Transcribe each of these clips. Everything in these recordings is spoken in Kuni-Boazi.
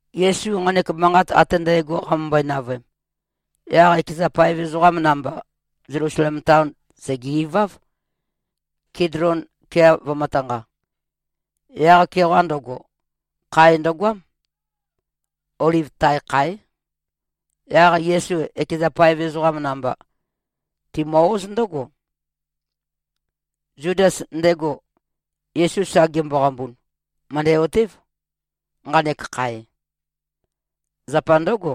Yesu nqanek manqat ate ndægo qamømbøe-navøem, yaq ekeza paev ezoqam namba, Zelusalem taon sège-iváv, Kidlon kea vømø̄tanqa. Yaq-keoqa ndøgo, khae ndøgoám. Oliv tae kháe. Yaq Yesu ekeza paev ezoqam namba, timø-óz ndǿgo. Zudas, ndego Yesu sa gemboqambun, mø̀ndæ-otév, nqanek khae. Zapa ndǿgo,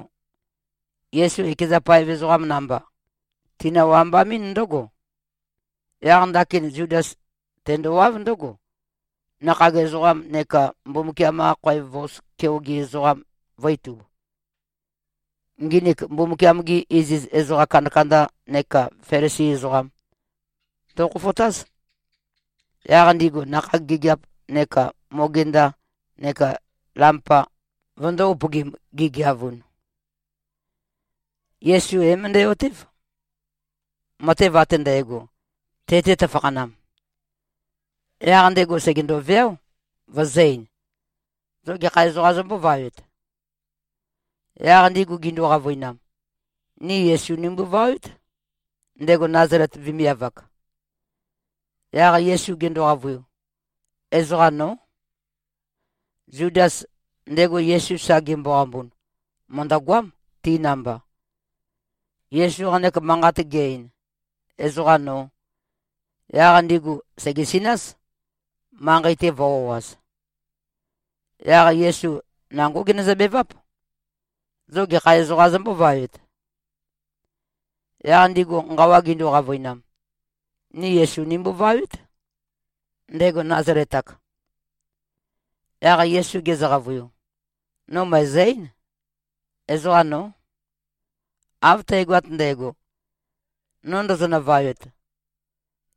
Yesu ekeza paev ezoqam namba, tinø-wambamɨ́n ndǿgo. Yaq ndakin Zudas tendowáv ndǿgo, nakhag ezoqam neka Mbumbukiam-qa khoev vos keoge ezoqam vø̄-itub. Nginik, Mbumbukiam-gi iziz ezoqa kandakanda neka Felisi ezoqam ndokhofotáz. Yaq ndigu nakhag gigiap neka mogenda neka lampa vøndō-upøgim, gigeavun. Yesu é-møndæ-otév, matev ate ndægo, te-te tøfakhanam. Yaq ndego sègendo-veáo, vøzø̄-ein, “Zo gekha ezoqā zombóvawet?” Yaq ndigu gindu-qavøinam, “Ni Yesu nimbovawét, ndego Nazalet vemiav-ak.” Yaq Yesu gendo-qavøiu, “Ezoqa nó.” Zudas, ndego Yesu sa gemboqambun, mø̀ndøgoám, ti namba. Yesu nqanek manqat ge-ein, “Ezoqa nō,” yaq ndigu sègesináz, manqei-te vø̄-o꞉az. Yaq Yesu nangó genøzø-beváp, “Zo gekha ezoqā zombóvawet?” Yaq ndigu nqawa gindu-qavøinam, “Ni Yesu nimbovawét, ndego Nazalet-ak.” Yaq Yesu gezø-qavøiu, “No mø̀ezø-eín. Ezoqa nó. Av tægoat ndægo, no ndozonø-vawet,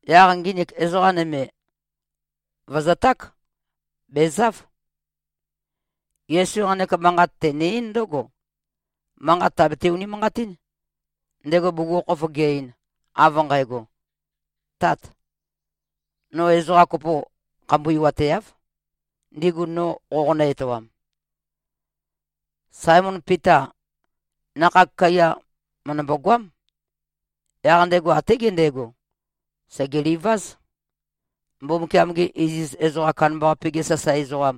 yaq nginik ezoqa nøme, vø̀zøták. Bèzáv.” Yesu nqanek manqat tene-eín ndǿgo, manqat tàbete-unimanqatín, ndego bugukhokhof ge-ein, av nqægo, “Tát! No ezoqa kopo khambuiwateáv, ndigu no qoqonø-etoam.” Saemon Pita, nakhag kaiya mø̀ndømbo-goám. Yaq ndego até gendego, segelìvāz, Mbumbukiam-ge iziz ezoqam kandambaqape-ge sasae ezoqam,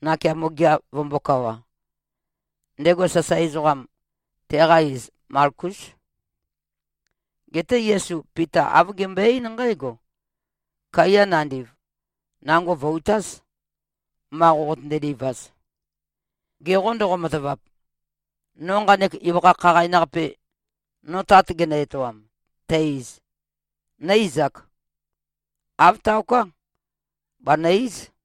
nakeamo gea vømbōkawa. Ndego sasae ezoqam, teqa iz Malkús. Geté Yesu Pita āv gembøe-eín nqǽgo, “Kaiya nandiv, nango vø̀-utáz, ma qoqotønde-livaz. Ge qô, ndoqo-matavap, no nqanek ibøkha khaqain-qape, no Tat genø-etoam, tæ-iz, nó-izāk? Āv taoká. Bànø-íz.”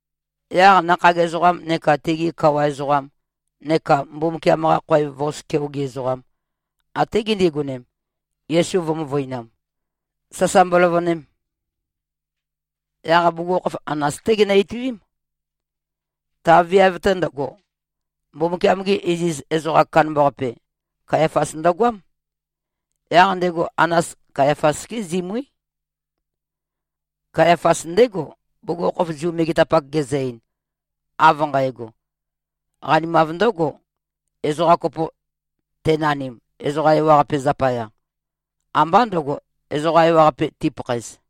Yaq nakhag ezoqam neka tigi kawa ezoqam neka Mbumbukiam-qa khoev vos keoge ezoqam, até gindigonem, Yesu vø̄-møvøinam, sasa mboløvønem. Yaq bugukhokhof Anas-té ginø-ituím. Ta viav-te ndøgo, Mbumbukiam-ge iziz ezoqam kandambaqape, Kayafas ndøgoám. Yaq ndego Anas, Kayafas-gé zimuí. Kayafas ndégo, bugukhokhof Zu megetapak gezø-ein, av nqægo, “Qanimav ndǿgo, ezoqa kopo tenanim, ezoqa ewaqape zapaya. Ambá ndø̄go, ezoqa ewaqape tipakhaez.”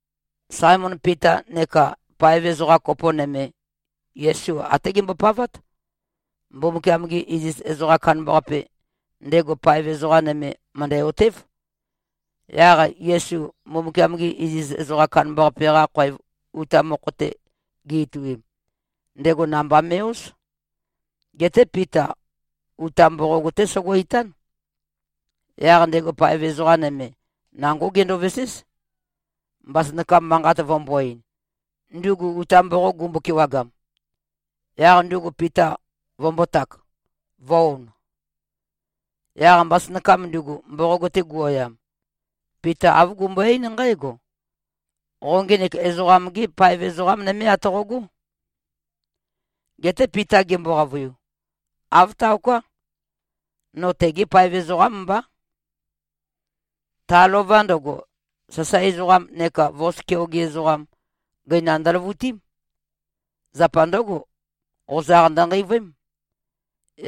Saemon Pita neka paev ezoqa kopo nøme, Yesu até gembopavát. Mbumbukiam-ge iziz ezoqam kandambaqape, ndego paev ezoqa nøme, mø̀ndæ-otév. Yaq Yesu Mbumbukiam-ge iziz ezoqam kandambaqape-qa khoev uta mokho-te gi-ituim, ndego namba me꞉-óz. Geté Pita uta mboqog-té sogo-itán. Yaq ndego paev ezoqa nøme, nangó gendoveséz, mbasønakam manqat vømbō-ein, ndugu uta mboqog gumbo-kewagam, yaq ndugu Pita vømbōtak, vø̄-on. Yaq mbasønakam ndugu, mboqog-te guoyam, Pita āv gumbøe-eín nqǽgo, “Qo ngenek ezoqam-gé paev ezoqa nømé atoqogó?” Geté Pita gembo-qavøiu, “Āv taoká. No tegé paev ezoqám mbá.” Ta lova ndøgo, sasae ezoqam neka vos keoge ezoqam, gøinam ndøløvutím. Zapa ndǿgo, qozaq ndønqeivøém.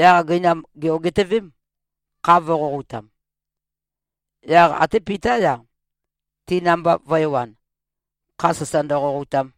Yaq gøinam gè-ogitøvém, kha vø̄qoqoutam. Yaq até Pitá-ya, ti namba vø̄ewan, kha sasa ndøqoqoutam.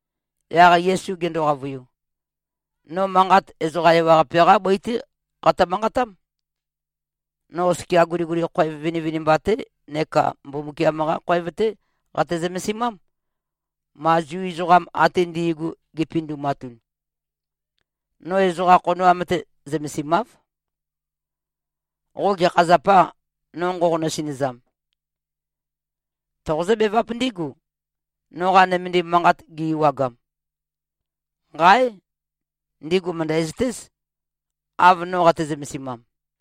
Yaq Yesu gendo-qavøiu, “No manqat ezoqa ewaqape-qá bøi-té qatø-manqatám. No oskia guliguli khoev vinivinimba-té neka Mbumbukiam-qa khoev-té qate-zømesimám, ma Zu ezoqam ate ndi꞉gu gi꞉pindumatun. No ezoqa khonoam-te zømesimáv. Qo gekha zapâ, no nqoqonø-sinøzam? Toqozǿ-beváp ndígu, noqa nømendim manqat gi-ewagam. Nqáe! Ndigu mø̀ndæzøtéz, av no qate-zømesimam.”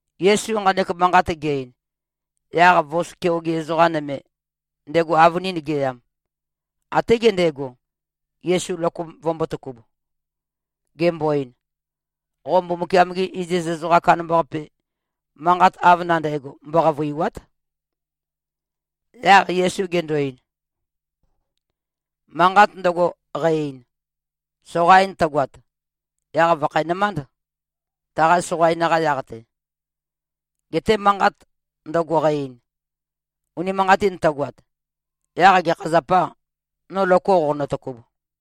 Yesu nqanek manqat ge-ein, yaq vos keoge ezoqa nøme, ndego avønin geyam, até gendego, Yesu loko vømbōtøkub, gembo-ein, “Qo Mbumbukiam-ge iziz ezoqam kandambaqape, manqat av nandægo mboqavø̀iwa᷄t!” Yaq Yesu gendo-ein, “Manqat ndøgo, qæ-ein, soqain tøgoat, yaq vòkhæ-nømánd, taqa soqain-qa yaq-te. Geté manqat ndøgo, qæ-ein, unimanqatin tøgoat, yaq gekha zapâ, no loko qoqonø-tøkub?”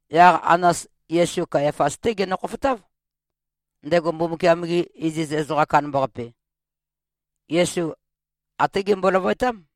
Yaq Anas Yesu Kayafas-té genø-khofotáv, ndego Mbumbukiam-ge iziz ezoqam kandambaqape. Yesu até gembo-løvøetám.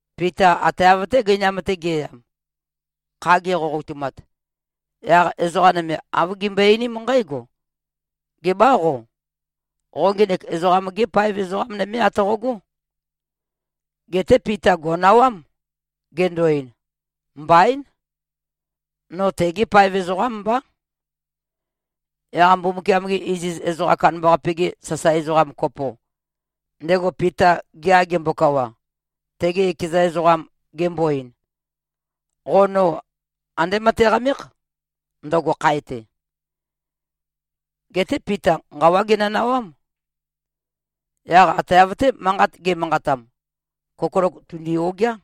Pita ate av-té gøinam-te ge꞉yam, kha geqoqoutumat, yaq ezoqa nøme āv gimbøe-einím nqǽgo, “Gebâ qo? Qo ngenek ezoqam-gé paev ezoqa nømé atoqogó.” Geté Pita gò꞉nawám, gendo-ein, “Mbaín. No tegé paev ezoqám mbá.” Yaq Mbumbukiam-ge iziz ezoqam kandambaqape-ge sasae ezoqam kopo, ndego Pita gea gembokawa, tege ekeza ezoqam, gembo-ein, “Qo no andé møteqamékh, ndøgo khae-te.” Geté Pita nqawá genønawám. Yaq ate av-té, manqat ge꞉manqatam, kokolok tùndi-ogeá.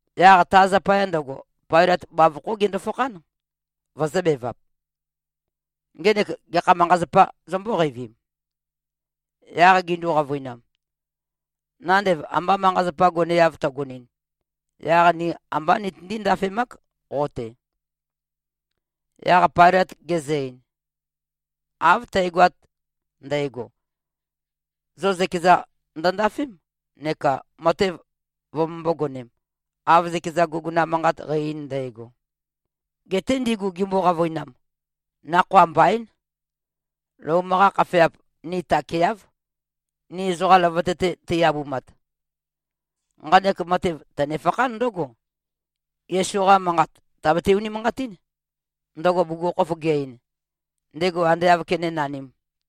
Yaq ta zapaya ndøgo, Pailøt bavokhó gendo-fakhán, vøzø̄bevap, “Ngenek gekha manqa-zapā zombó-qeivim?” Yaq gindu-qavøinam, “Nandev amba manqa-zapa goneav tøgonɨn, yaq ni ambá nitøndí-ndafemák qo-te.” Yaq Pailøt gezø-ein, “Av tægoat ndægo, zo zøkeza ndøndafém, neka matev vømømbō-gonem, av zøkeza guguna manqat qæ-ein ndægo.” Geté ndigu gimbo-qavøinam, “Nakhoa mbaín. Lom-qa khafeap ni takeáv, ni ezoqam løvøte-te tei-abumat.” Nqanek matev tønefakhán ndǿgo, Yesu-qa manqat tàbete-unimanqatín, ndøgo bugukhokhof ge-ein, ndego ande āv kenénanīm.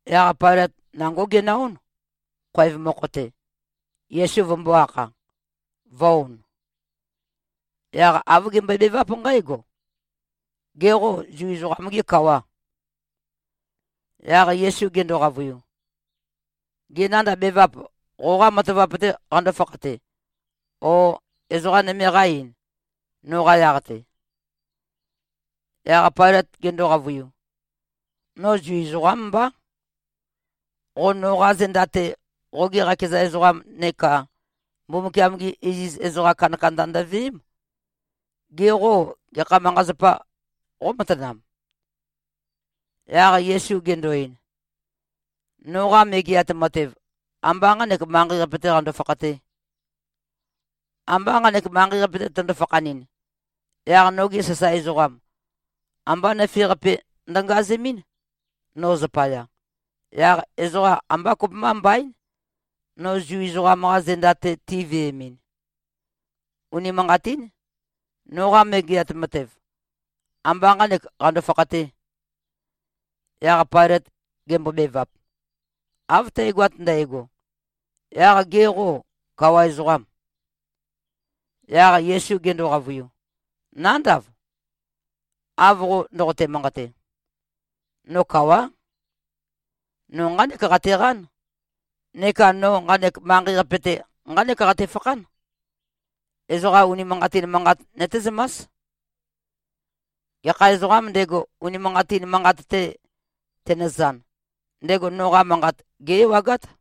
Yaq Pailøt nangó genø-ón, khoev mokho-te, Yesu vømbō-akha, vø̄-on. Yaq āv gembøebeváp nqǽgo, “Gê, qo Zu ezoqam-gê kawà?” Yaq Yesu gendo-qavøiu, “Gê, nandav bevap qoqâ matavap-tē qandó-fakhate, ó, ezoqā nøme qá-ein, noqa yaq-te?” Yaq Pailøt gendo-qavøiu, “No Zu ezoqám mbá. Qo noqa zenda-te, qogi qakeza ezoqam neka Mbumbukiam-gi iziz ezoqa kandakanda ndøveém. Ge qô, gekha manqa-zapa qómatanam?” Yaq Yesu gendo-ein, “Noqa Megeat Matev, ambá nqanek manqei-qape-tē qando-fakhatē. Amba nqanek manqei-qape-te tøndo-fakhanɨn, yaq nogi sasae ezoqam, ambá nøfe-qape ndøngazemɨ́n, no zapaya, yaq ezoqa ambá kopømba mbaín, no Zu ezoqam-qa zenda-te tiveemɨn. Unimanqatín. Noqa Megeat Matev, ambá nqānek qando-fakhatē.” Yaq Pailøt gembobevap, “Av tægoat ndægo, yaq ge qô, kawa ezoqâm?” Yaq Yesu gendo-qavøiu, “Nándav, av qo ndoqote-manqate. No kawá. No nqánek qateqán neka no nqanek manqei-qape-te nqánek qatefakhán, ezoqam unimanqatin manqat nøtézømás. Gekha ezoqām ndego, unimanqatin manqat-te tenøzan, ndego noqa manqat gé-ewagát.”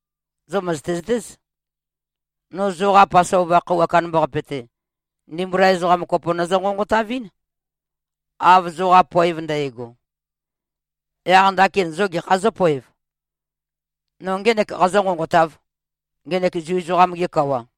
Zo mø̀zøte-zøtéz. No zoqa Pasova khøuwa kandambaqape-te, ndimbula ezoqa kopo nøzø-nqonqotavɨ́n, av zoqa poev ndægo. Yaq ndakin zo gekhā zǿpoev? No ngének qazǿ-nqonqotāv, ngenek Zu ezoqam-ge kawa?”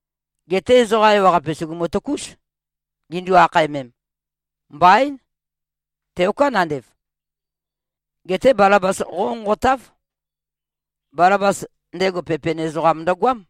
Geté ezoqa ewaqape sùgumu-tøkúz, gindu-akhaemem, “Mbaín. Teoká nandev. Geté Balabas qónqonqotáv.” (Balabas, ndego pepen ezoqam ndøgoám.)